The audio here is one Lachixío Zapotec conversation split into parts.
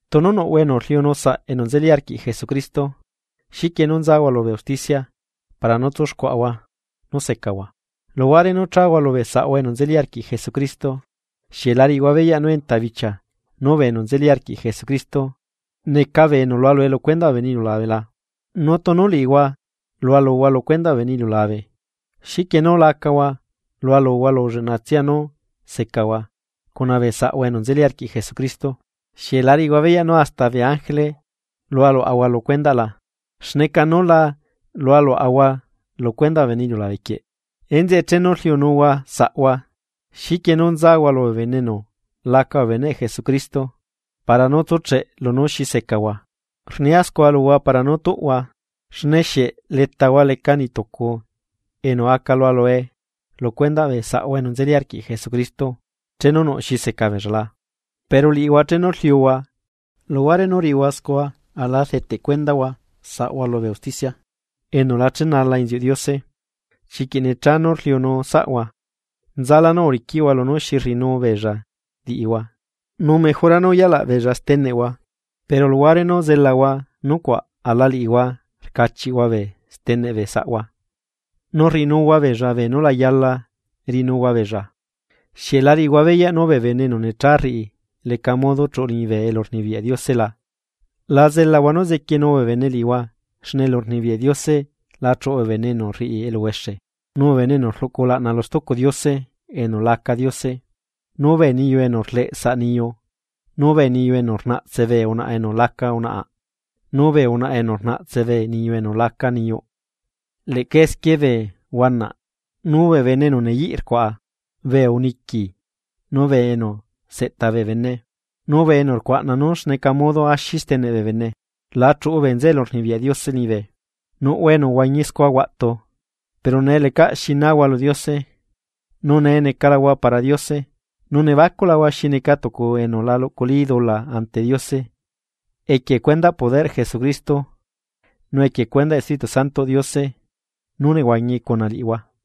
Tunu nuꞌhua enu rliunu saꞌ enu nzeli arquiꞌ Jesucristo, xiquie nú nzahua lubee usticia para nú tsuxcuaꞌa nú secahua, luhuare nú chahua lubee saꞌhua enu nzeli arquiꞌ Jesucristo. ¿Xieꞌ lariꞌihua beyaꞌ nú enta bichia nú bee enu nzeli arquiꞌ Jesucristo neca bee enu lualue lu cuendaꞌ bee bene iliulabe la? Nu tunu liꞌihua lualuhua lu cuendaꞌ bee bene iliulabe, xiquie nú lacahua lualuhua lu lleꞌnatsia nú secahua cuna bee saꞌhua enu nzeli arquiꞌ Jesucristo. ¿Xieꞌ la riꞌihua beyaꞌ nú hasta bee ángele lualuaꞌahua lu cuendaꞌ la? ¡Xneca nú la lualuaꞌahua lu cuendaꞌ bee bene iliulabe quieꞌ! Enzeꞌe chenu rliunuhua saꞌhua, ¿xiquie nú nzahua lubee bene enu laca bee beneꞌ Jesucristo para nú tsucheꞌ lunú xi secahua? Rnia scua luhua para nú tuꞌhua. ¿Xne xieꞌ letahua leca niꞌ tucu enu aca lualue lu cuendaꞌ bee saꞌhua enu nzeli arquiꞌ Jesucristo chenu nuꞌ xi seca beella la? Pero liꞌihua chenu rliuhua luhuare nú riꞌihua scua aꞌla rdeteꞌ cuendahua saꞌhua lubee usticia, enu la chenala inziuꞌ Diose. Chiquiꞌ necha nú rliunu saꞌhua. Nzalá nú uriquiꞌhua lunú xi rriꞌinu beella liꞌihua. Nu mejora nú uyalaꞌ beella steneꞌhua. Pero luhuare nú zelahua nucuaꞌ aꞌla liꞌihua rcachiꞌhua bee steneꞌ bee saꞌhua, nu rriꞌinuhua beella beenú la yala riꞌinuhua beella. ¿Xieꞌ lariꞌihua beyaꞌ nú bee bene enu necha rriꞌi leca modo chuꞌu liñibe elurnibiyaꞌ Diose la? La zelahua nú zequienu bee bene liꞌihua xne elurnibiyaꞌ Diose la chuꞌu bee bene enu rriꞌi eluhuexe, nu bee enu rluꞌcu ulaꞌna lu stucu diose enu laca diose nu bee niyu enu rleꞌ saꞌ niyu, nu bee niyu enu rnaꞌtse bee unaꞌa enu laca unaꞌa, nu bee unaꞌa enu rnaꞌtse bee niyu enu laca niyuꞌ. Leꞌca esquie bee huanaꞌ, nu bee bene enu neyiꞌ rcuaꞌa, bee uniqui nu bee enu seꞌta bee bene, nu bee enu rcuaꞌna nú xneca modo axi steneꞌ bee bene, la chuꞌu bee nzeꞌe elurnibiyaꞌ Diose liñibe. Nuꞌhua enu uhuañi scua huaꞌtu, pero nee lecaꞌ xi nahua lu Diose, nu nee necalahua para Diose, nu nebacuꞌlahua xi neca tucu enu la luꞌculi dula ante Diose equie cuendaꞌ poderꞌ Jesucristo nu equie cuendaꞌ Espíritu Santoꞌ Diose nú nehuañi cuna liꞌihua.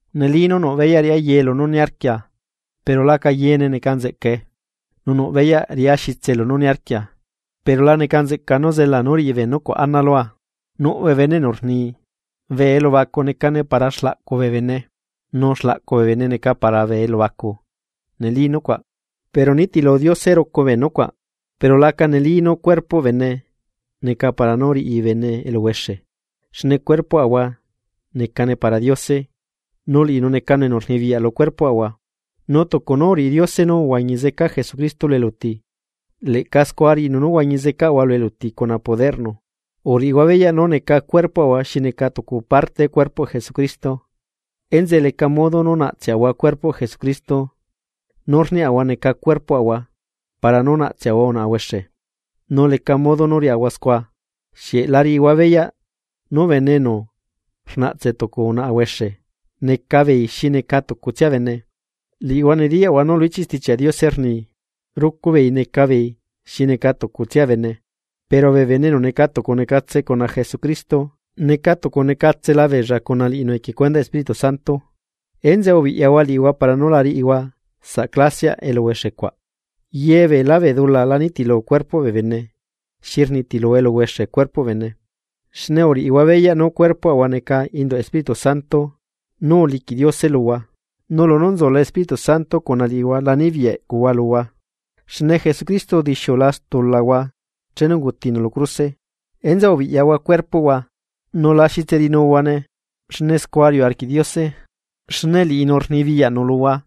Neli nú nuꞌ beyaꞌ riꞌá yee lunú niarquia pero laca yeene neca nzeꞌcae. Nu nuꞌ beyaꞌ riꞌá xitse lunú niarquia, pero la neca nzeꞌca nú zela nú riꞌi bee nucuaꞌ ana lua. Nuꞌ bee bene enu rni: Bee elubacu necane para xlaꞌcu bee bene, nu xlaꞌcu bee bene neca para bee elubacu. Neli nucuaꞌ, pero nitilu Diose rucu bee nucuaꞌ, pero laca neli nú cuerpoꞌ bene neca para nú riꞌi bene eluhuexe. Xne cuerpoꞌahua necane para Diose, nu liꞌinu necanu enu rnibiyaꞌ lu cuerpoꞌahua. Nu tucu nú uriꞌi Diose nú uhuañi zeca Jesucristo lu eluti, leꞌca scua riꞌinu nú huañi zecaꞌahua lu eluti cuna poderꞌnu. ¿Uriꞌihua beyaꞌ nú neca cuerpoꞌahua xi neca tucu parte cuerpoꞌ Jesucristo. Enzeꞌe leca modo nú naꞌtseꞌahua cuerpoꞌ Jesucristo nú rniaꞌahua neca cuerpoꞌahua para nú naꞌtseꞌahua unaꞌa huexe? Nu leca modo nú riaꞌahua scua. Xieꞌ la riꞌihua beyaꞌ nú bene enu rnaꞌtse tucu unaꞌa huexe, necabeei xineca tucutsia bene. Liꞌihua nediyaꞌhua nú lu ichiꞌ Stichiaꞌ Diose rni: “Rucu beei neca beei xi neca tucutsia bene.” Pero bee bene enu neca tucu necatse cuna Jesucristo, neca tucu necatsela beella cuna liꞌinu equie cuendaꞌ Espíritu Santo. Enzeꞌe ubiꞌyahua liꞌihua para nú la riꞌihua saꞌ clasiaꞌ eluhuexe cuaꞌ. Ye beelá bee dula la nitilu cuerpoꞌ bee bene, xi rnitilu eluhuexe cuerpoꞌ bene. Xne uriꞌihua beyaꞌ nú cuerpoꞌhua neca induꞌ Espíritu Santo nú uliquiꞌ Diose luhua, nu lunú nzula Espíritu Santo cuna liꞌihua la nibiyaꞌ eꞌcuhua luhua. Xne Jesucristo udixiula stulahua chenu ungutinu lu cruse. Enzeꞌe ubiꞌyahua cuerpoꞌhua nu la xitse riꞌinuhuane xne scua riuꞌ arquiꞌ Diose, xne liꞌinu rnibiyaꞌnu luhua.